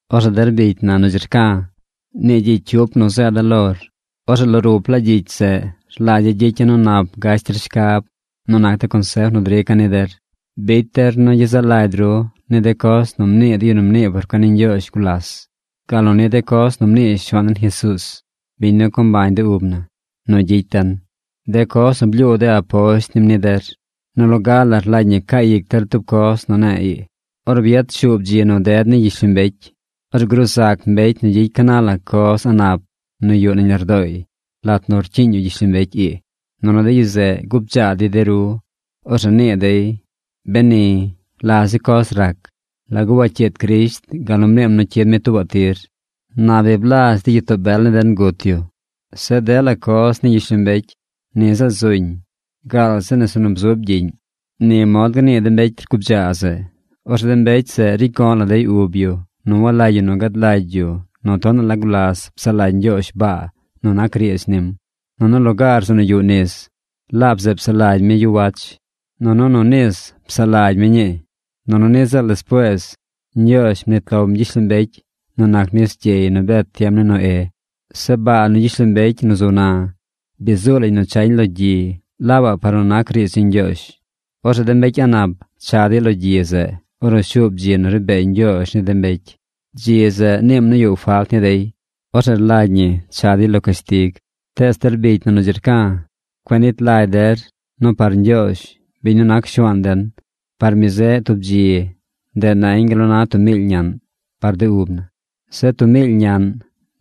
Orzeꞌ der bicy na nu dzi rca̱, nii gyicy cyup nu zeeda̱ lor. Orzeꞌ lo ruplaa gyicy zeꞌ rlagya̱ gyicya̱ nu nap gash der shcab nu nac de consef nu drica̱ ni der. Bicy der nu gyezaꞌ lagy ru ni de coz nu mnii de yu nu mnii por cuen ni Ñgyoozh gulas, gal nu ni de coz nu mnii Shuaan den Jesuuz, biñ nu co mbañ de ub na, nu gyicy den, de coz nu blyuu de aposht nim ni der. Nu loga la rlagy ñi caa ic der tub coz nu ne̱e̱ ii: ornu bi yad shuub dzi nu ded ni gyishlombecy, orzeꞌ gruu zac mbecy nu gyicy ca na la coz a̱ꞌ nap nu yuꞌ nañ lardooy lat nu rcyiiñ yu gyishlombecy ii. Nunu de yu zeꞌ gubdzaa dey de ru. Orzeꞌ nii dey: “Beni, ¿la zi coz rac? ¿Lagu wacyiid Crisht gal nu mniim nu cyid mi tuubaꞌ tir? Na bi blazh de gyitoo bel ni den gut yu. Zeꞌ dela coz ni gyishlombecy ni ziꞌl zuñ gaal zi nese nu bzub gyiꞌñ.” Ni mod gnii de mbecy rgubdzaa zeꞌ. Orzeꞌ de mbecy zeꞌ ricy go̱ꞌ la dey ub yu nu walagy yu gad lagy yu nu tonaꞌ la gulas psaꞌ lagy Ñgyoozh baa nu nac riidz nim. Nunu lugaar zeꞌ nu yuꞌ nis, laab zeꞌ psaꞌ lagy mi yu wach. Nunu nu nis psaꞌ lagy mi ñii. Nunu niꞌ ziꞌl despuees Ñgyoozh mnit lom gyishlombecy nu nac nis gyey nu bet tiem ni Noé. Zeꞌ baa nu gyishlombecy nu zu na, bi zuu lañ nu chañ lo gyi laabaꞌ par nu nac riidz ni Ñgyoozh. Orzeꞌ de mbecy a̱ꞌ nap cha dey lo gyi zeꞌ ornu shuub dzi nu ri bee Ñgyoozh ni de mbecy. Dzi zeꞌ niim nu yuꞌ falt ni dey. Orzeꞌ rlagy ñi cha dey lo cashtig. Tees der bicy na nu dzi rca̱, cueꞌ nit lagy der nu par Ñgyoozh, biñ nu nac Shuaan den, par mi zeꞌ tub dzi, ndeꞌ nañ gal nu na tub miily ñaꞌn par de ub na. Zeꞌ tub miily ñaꞌn,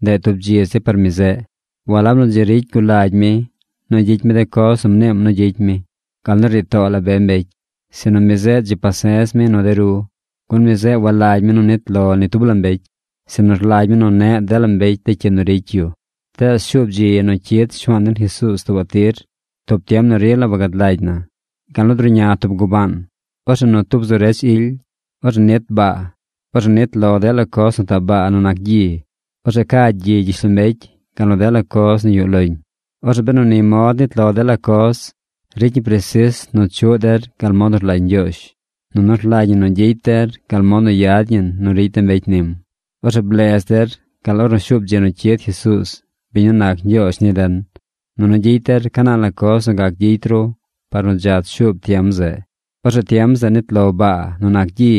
ndeꞌ tub dzi zi par mi zeꞌ. Walab nu dzi ricy gul lagy mi nu gyicy mi de coz nu mniim nu gyicy mi, gal nu rnii too la be mbecy, sinu mi zeꞌ dzi pase̱z mi nu de ru. Gun mi zeꞌ walagy mi nu nit lo ni tub mbecy, sinu rlagy mi nu neꞌ dela mbecy de cyi nu ricy yu. Tees shuub dzi nu cyid Shuaan den Jesuuz tuubaꞌ tir, tub tiem nu rila wagad lagy na, gal nu druꞌña tub gubaan. Orzeꞌ nu tub nu zu redz ily, orzeꞌ nit baa. Orzeꞌ nit lo dela coz nu taꞌ baa nu nac gyi. Orzeꞌ ca gyi gyishlombecy gal nu dela coz nu yuꞌ loñ. Orzeꞌ benu ni mod nit lo dela coz, ricy ñi presis nu chuꞌ der gal mod nu rlagy Ñgyoozh, nunu rlagy ñi nu gyicy der gal mod nu yad ñi nu ricy de mbecy nim. Orzeꞌ blez der gal ornu shuub dzi nu cyid Jesuuz, biñ nu nac Ñgyoozh ni den. Nunu gyicy der ca na la coz nu gac gyicy ru par nu dzach shuub tiem zeꞌ. Orzeꞌ tiem zeꞌ nit lo baa nu nac gyi.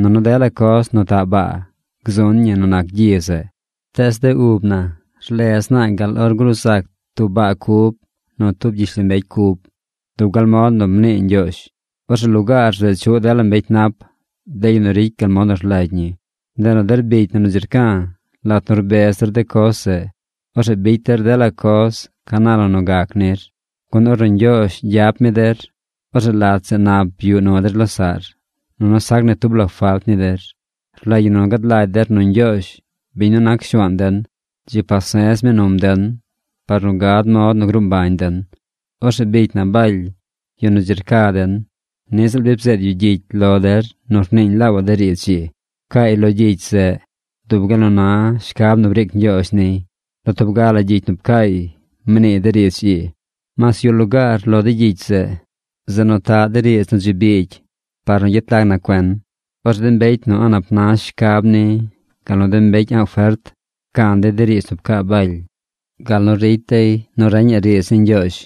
Nunu dela coz nu taꞌ baa gzun ñi nu nac gyi zeꞌ. Tees de ub na rlez naa gal or gruu zac tub baa cub nu tub gyishlombecy cub, dub gal mod nu mnii Ñgyoozh. Orzeꞌ lugaar zeꞌ chuꞌ dela mbecy nap, de yu nu ricy gal mod nu rlagy ñi. Ndeꞌ nu der bicy na nu dzi rca̱, lat nu rbez der de coz zeꞌ, orzeꞌ bicy der dela coz ca na la nu gac nir, gun ornu Ñgyoozh gyap mi der, orzeꞌ lat zeꞌ nap yuꞌ nu der losaꞌr, nunu sac ni tub la falt ni der. Rlagy ñi nu gad lagy der nu Ñgyoozh, biñ nu nac Shuaan den, dzi pase̱z mi num den par nu gad mod nu gruu mbañ den. Orzeꞌ bicy na Baly, yu nu dzi rca den, niꞌ ziꞌl bi bzeed yu gyicy lo der nu rniiñ laabaꞌ de riidz ii. Pcaay lo gyicy zeꞌ dub gal nu na shcab nu briic Ñgyoozh niy. Lo tub ga la gyicy nu pcaay mniiy de riidz ii. Mas yuꞌ lugaar lo de gyicy zeꞌ, zeꞌ nu taꞌ de riidz nu dzi biigy par nu gyet lag na cuen. Orzeꞌ de mbecy nu a̱ꞌ nap na shcab ni gal nu de mbecy a̱ꞌ fert pcan dey de riidz nu pcaa Baly, gal nu ricy dey nu reñaꞌ riidz ni Ñgyoozh.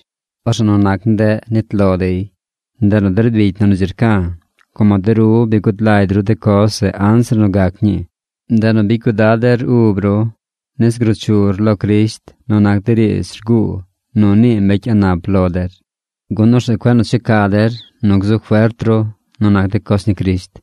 Orzeꞌ nu nac ndeꞌ nit lo dey. Ndeꞌ nu der bicy na nu dzi rca̱, como de ru bi gud lagy ru de coz zeꞌ anzir nu gac ñii, ndeꞌ nu bicy cuidad der ub ru nis gruu chur lo Crisht nu nac de riidz rguu nu nii mbecy a̱ꞌ nap lo der. Gun orzeꞌ cueꞌ nu checa der nu gzu fert ru nu nac de coz ni Crisht,